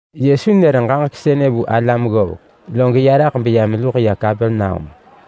Yesu nër ġaġek sënë vu alam ggovek, log ya raḳ beya meluḳ ya Kapernaum.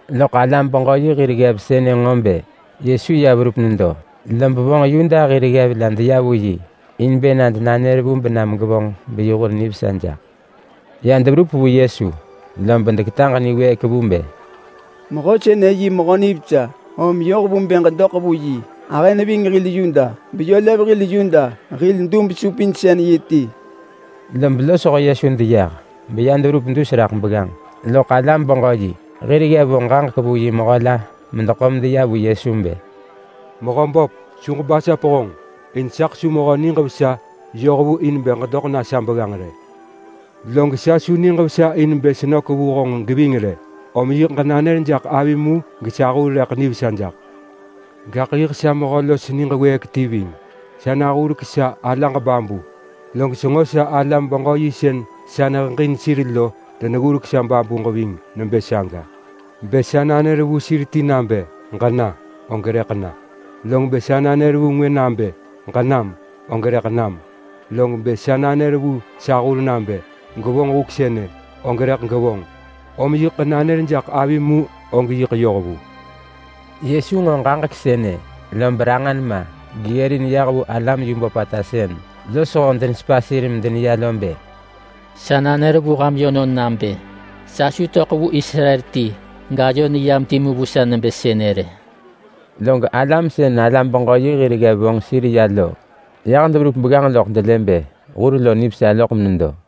Loḳ alam-beġö-yi hir ggev sënë nġo bë Yesu ya verup nedo, lob vonġ Yuda hir ggev la deya vu yi in bë na denanër vu benam gevonġ beyi hur nivesa jaḳ. Ya deverup vu Yesu, lob deketaġ niwëëk vu bë, “Mehö sënë yi mehö nivesa, om yoh vu bë ġedoḳ vu yi. Ahë neving hil Yuda, beyö lev hil Yuda hil dub-supinsën-yi ti.” Lob losho Yesu deyah, beya deverup dus raḳ begganġ, loḳ alam-beġö-yi hir ggev vo ġaġek vu yi mehö la medeḳo medeya vu Yesu bë, “Mehöböp, su ġebasap honġ, in saḳ su mehö niġ vesa yoh vu in bë ġedoḳ na sa begganġ rë. Log sa su niġ vesa in bë senök vu honġ geving rë. Om yiḳ ġenanër jaḳ avim mu, gesa hur rëḳ nivesa jaḳ. Gaḳ yiḳ sa mehö los niġ wëëk ti ving. Sa nahurek sa alaġ babu, log senġo sa alam-beġö-yi sën sa neheġin sir lo deneggurek sa babuġ ving nebë saga. Bë sa nanër vu sir ti nabë, ‘Ġena!’, og rëḳ na. Log bë sa nanër vu ngwë nabë, ‘Ġenam!’, og rëḳ nam. Log bë sa nanër vu sa hur nabë, ‘Gwevonġ huk sënë!’, og rëḳ gevonġ. Om yiḳ ġenanër jaḳ avim mu og yiḳ yoh vu.” Yesu nġo ġaġek sënë, lob ranġa nema geggërin yah vu alam yu böpata sën losho denesepa sir medeneya lo bë, “Sa nanër vu ham yönon nabë sa su töḳ vu Israel ti gayo neyam timu vu sa nebë sënë rë.” Log alam sën alam-beġö-yi hir ggev vonġ sir ya lo yah deverup begganġ loḳ delë bë hur lo nivesa loḳ menedo.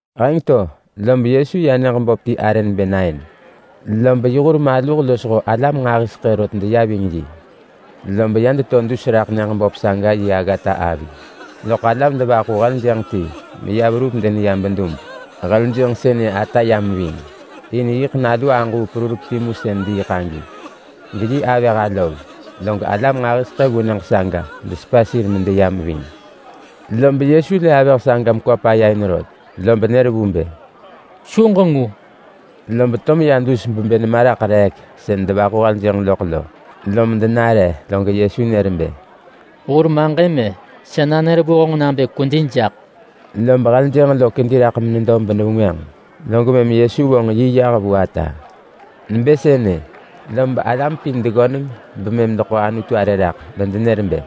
Heng to, lob Yesu ya nyëġ böp ti arë nebë Nain. Lob yi hur maluh losho alam nġahiseḳë rot deya ving yi. Lob ya deto dus raḳ nyëġ böp saga yi aggata avi, loḳ alam devaḳu heljënġ ti meya verup deneya bedub. Heljënġ sënë ata yam ving. In yiḳ nalu aġuu perurek timu sën diiḳ agi, geyi avëh alov. Log alam nġahiseḳë vu nyëġ saga desepa sir medeyam ving. Lob Yesu lë avëh saga mekwa paya in rot, lob nër vu bë, “Su ġengu!” Lob to meya dus bebë nema raḳ reek sën devaḳu heljënġ loḳ lo, lom denare. Log Yesu nër bë, “Hur maġëm-e! Sa nanër vu honġ nabë kwedi jaḳ!” Lob heljënġ lo kedi raḳ menedo benevengwënġ. Log mëm Yesu vonġ yi yah vu ata. Nebë sënë, lob alam pin deggöneng bemëm deḳo Anutu arë raḳ medenër bë,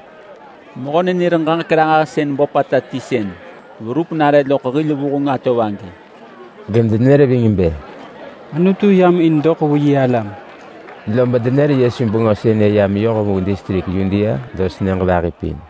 “Mehö-nenër-ġaġek-ranġahsën böpata ti sën verup nare loḳ hil vuheng atov agi.” Gedenër ving bë, “Anutu yam in doḳ vu yi alam.” Lob denër Yesu bengö sënë ya meyoh vu distrik Yudea los nyëġ vahi pin.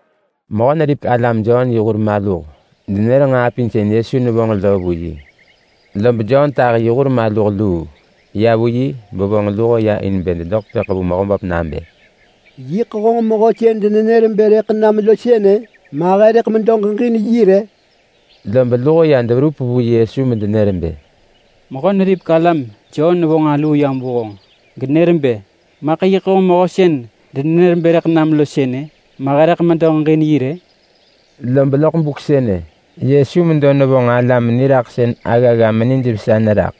Mehö-neripek-alam Jon yi hur maluh denër nġaa pin sën Yesu nevonġ lo vu yi. Lob Jon tahi yi hur maluh luu ya vu yi bevonġ luho ya in bë dedoḳ tepëḳ vu Mehöböp nabë, “Yiḳ honġ mehö sën denenër bë rëḳ nam lo sënë, ma he rëḳ medo ġeġin yi rë?” Lob luho ya deverup vu Yesu medenër bë, “Mehö-neripek-alam Jon vonġ aluu yam vu honġ genër bë, ‘Maḳ yiḳ honġ mehö sën denenër bë rëḳ nam lo sënë, ma he rëḳ medo ġeġin yi rë?’” Lob loḳ buk sënë, Yesu medo nevonġ alam niraḳsën aggagga menijvesa neraḳ.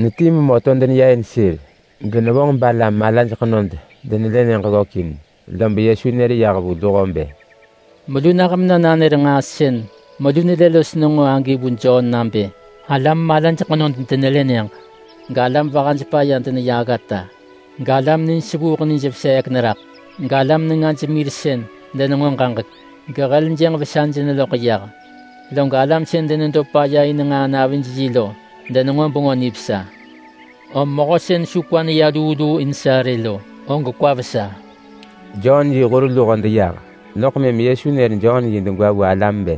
Netii memö to deneya in sir, genevonġ balam malaj ḳenod denelë nyëġ ggökin. Lob Yesu nër yah vu luho bë, “Melu nah mena nanër nġaa sën melu nelë los nenġo agi vu Jon nabë: Alam malaj ḳenod denelë nyëġ, galam vahaj paya deneya aggata, galam nij sevuuḳ nij veseek neraḳ, galam nengaj mir denenġo ġaġek, galam sën denediiḳ lo vesaj neloḳ yah, log alam sën denedo paya in nġaa navij yi lo denenġo Bengö Nivesa. Om mehö sën su kwa neya luu luu in sa rë lo, og kwa vesa.” Jon yi hur luho deyah, loḳ mëm Yesu nër Jon yi degwa vu alam bë,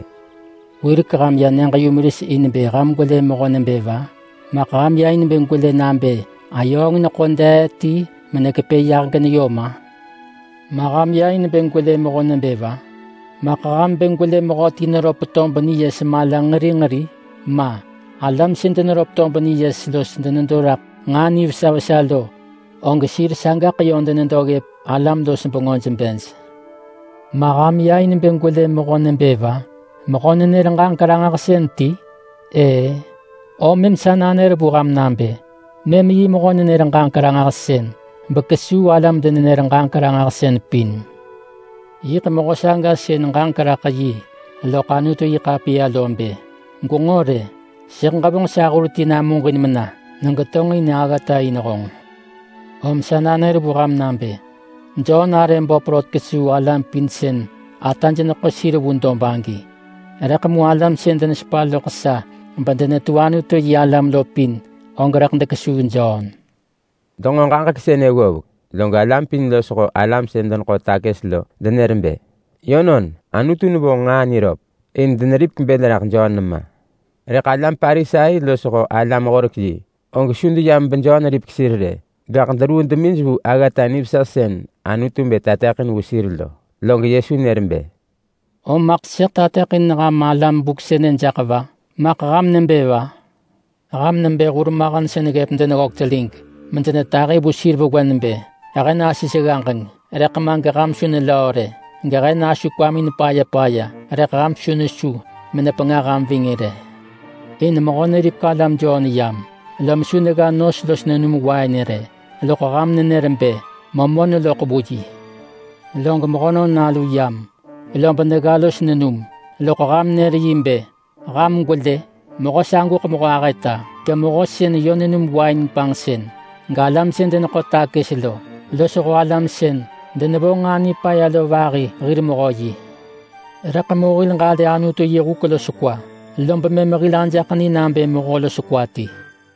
“Wirek ham ya nyëġ-yumeris in bë ham gwele mehö nebë va? Maḳ ham ya in bë gwelë nabë ayööng neḳo dee ti menekepë ya geneyom-a? Ma ham ya in bë gwelë mehö nebë va? Maḳ ham bë gwelë mehöti neröp tob niyes mala nġeri nġeri? Ma. Alam sën deneröp tob niyes los denedo raḳ nġaa nivesa vesa lo, og sir sagaḳ yö denedo ggëp alam-los-bengöj bej. Ma ham ya in bë gwelë mehö nebë va? Mehö-nenër-ġaġek-ranġahsën ti? Ëë-ë, om mëm sa nanër vu ham nabë, mëm yi mehö-nenër-ġaġek-ranġahsën, bekesuu alam denenër-ġaġek-ranġahsën pin. Yiḳ mehö saga sën ġaġek raḳ yi loḳ Anutu-yi-ḳapiya lo bë: Gwenġo rë, sëḳ ġevonġ sa hur ti namuġin mena negetonġin aggata in honġ. Om sa nanër vu ham nabë: Jon arë böp rot kesuu alam pin sën ataj neḳo sir vu dob agi. Rëḳ mu alam sën denesepa loḳ sa bedenetu Anutu-yi-alam lo pin, og rëḳ dekesuu Jon.” Denġo ġaġek sënë ggovek, log alam pin losho alam sën deneḳo takës lo denër bë, “Yönon. Anutu nevonġ nġaa niröp.” In deneripek bël raḳ Jon nema. Rëḳ alam Parisai losho alam-horek-yi, og su deyam beJon ripek sir rë, gaḳ deruu demij vu aggata nivesa sën Anutu bë tateḳin vu sir lo. Log Yesu nër bë, “Om maḳ sëḳ tateḳin ham alam buk sënë jaḳ va? Maḳ ham nebë va? Ham nebë hurmahen sën ggëp deneggök telig medenetahi vu sir vewen bë: ‘He nasis ggaġeng, rëḳ ma geham su nelöö rë. Gehe nasu kwamin paya paya, rëḳ ham su nesu menepengah ham ving rë.’ In mehö neripek alam Jon yam, lom su negga nos los nenum wain rë. Loḳ ham nenër bë, ‘Memö neloḳ vu yi.’ Log Mehönon Nalu yam, lob negga los nenum, loḳ ham nër yi bë, ‘Ham gwelë, mehö saguḳ mehö ahëta, gemehö sën yö nenum wain panġsën. Galam sën deneḳo takës lo, losho alam sën denevonġ nġaa nipaya lo vahi hir mehö yi.’ Rëḳ mu hil ġalë Anutu yi huk los kwa, lob mëm hil ajaḳ ni nabë mehö los kwa ti.”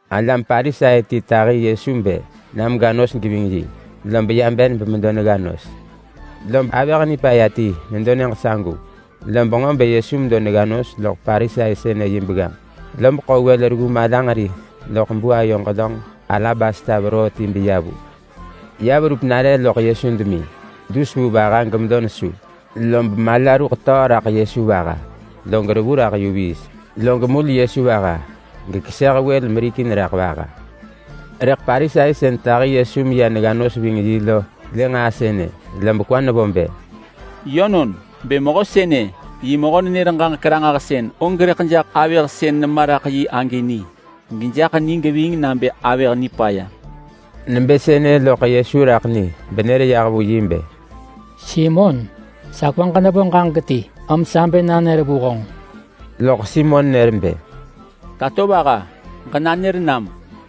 Alam Parisai ti tahi Yesu bë na mega nos geving yi, lob ya ben bemedo negga nos. Lob avëh nipaya ti nedo nyëġ sagu, lob nġo bë Yesu medo negga nos loḳ Parisai sënë yi begganġ. Lob ḳo wël reggu malanġeri loḳ buayo ġelönġ alabasta veroo ti beya vu. Ya verup nare loḳ Yesu demi dus vu vaha gemedo nesu, lob mala ruḳ töö raḳ Yesu vaha, log revu raḳ yu viis. Log mul Yesu vaha, gekeseh wël merikin raḳ vaha. Rëḳ Parisai sën tahi Yesu meya negga nos ving yi lo lë nġaa sënë, lob kwa nevo bë, “Yönon, bë mehö sënë yi mehö-nenër-ġaġek-ranġahsën, og rëḳ jaḳ avëh sën nema raḳ yi agi ni, gejaḳ ni geving nabë avëh nipaya.” Nebë sënë loḳ Yesu raḳ ni benër yah vu yi bë, “Simon, sa kwaġ nevo ġaġek ti, om sa bë nanër vu honġ.” Loḳ Simon nër bë, “Tatovaha, ġenanër nam.”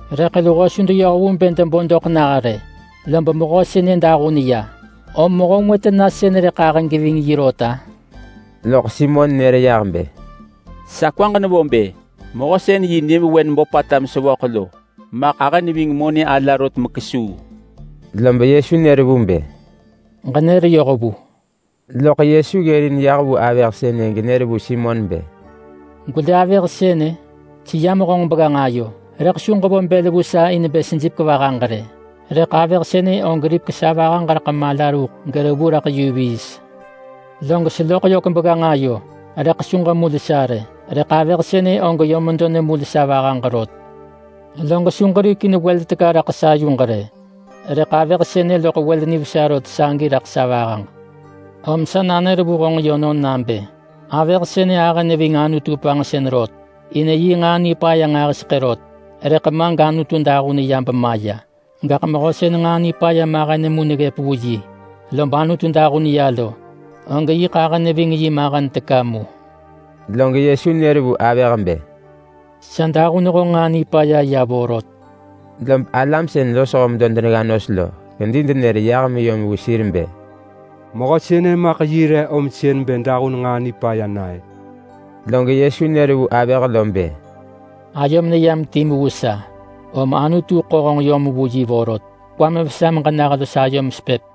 Rëḳ luho su deyoh vu bë debo doḳ nah rë, lob mehö sënë nilël raḳ luho. Om mehö ngwë tena sën rëḳ ahë geving yi rot-a?” Loḳ Simon nër yah bë, “Sa kwaġ nevo bë mehö sën yi nyëvewen böpata mesevöḳ lo maḳ ahë neving monë ala rot mekesuu.” Lob Yesu nër vu bë, “Ġenër yoh vu.” Loḳ Yesu ggërin yah vu avëh sënë genër vu Simon bë, “Gwelë avëh sënë? Seyam honġ begganġ ayo, rëḳ su ġevo bël vu sa in bë sejipek vahaġ rë. Rëḳ avëh sënë og ripek sa vahaġ raḳ mala ruḳ gerevu raḳ yu viis. Log seloḳ yök begganġ ayo rëḳ su ġemul sa rë, rëḳ avëh sënë og yö medo nemul sa vahaġ rot. Log su ġerikin wël teka raḳ sa yuġ rë, rëḳ avëh sënë loḳ wël nivesa rot sagi raḳ sa vahaġ. Om sa nanër vu honġ yönon nabë: Avëh sënë ahë neving Anutu panġsën rot in yi nġaa nipaya nġahiseḳë rot, rëḳ ma gAnutu dahun ya bemaya. Gaḳ mehö sën nġaa nipaya mahen mu neggëp vu yi, lob Anutu dahun ya lo, og yiḳ ahë neving yi mahen teka mu.” Log Yesu nër vu avëh bë, “Sa dahun honġ nġaa nipaya ya vorot.” Lob alam sën losho medo denegga nos lo kedi denër yah meyom vu sir bë, “Mehö sënë maḳ yi re om sën bë dahun nġaa nipaya na-ë?” Log Yesu nër vu avëh lo bë, “Ayom neyam timu vu sa, om Anutu ḳo honġ yom vu yi vorot. Kwam vesa meġena los ayom sepëp.”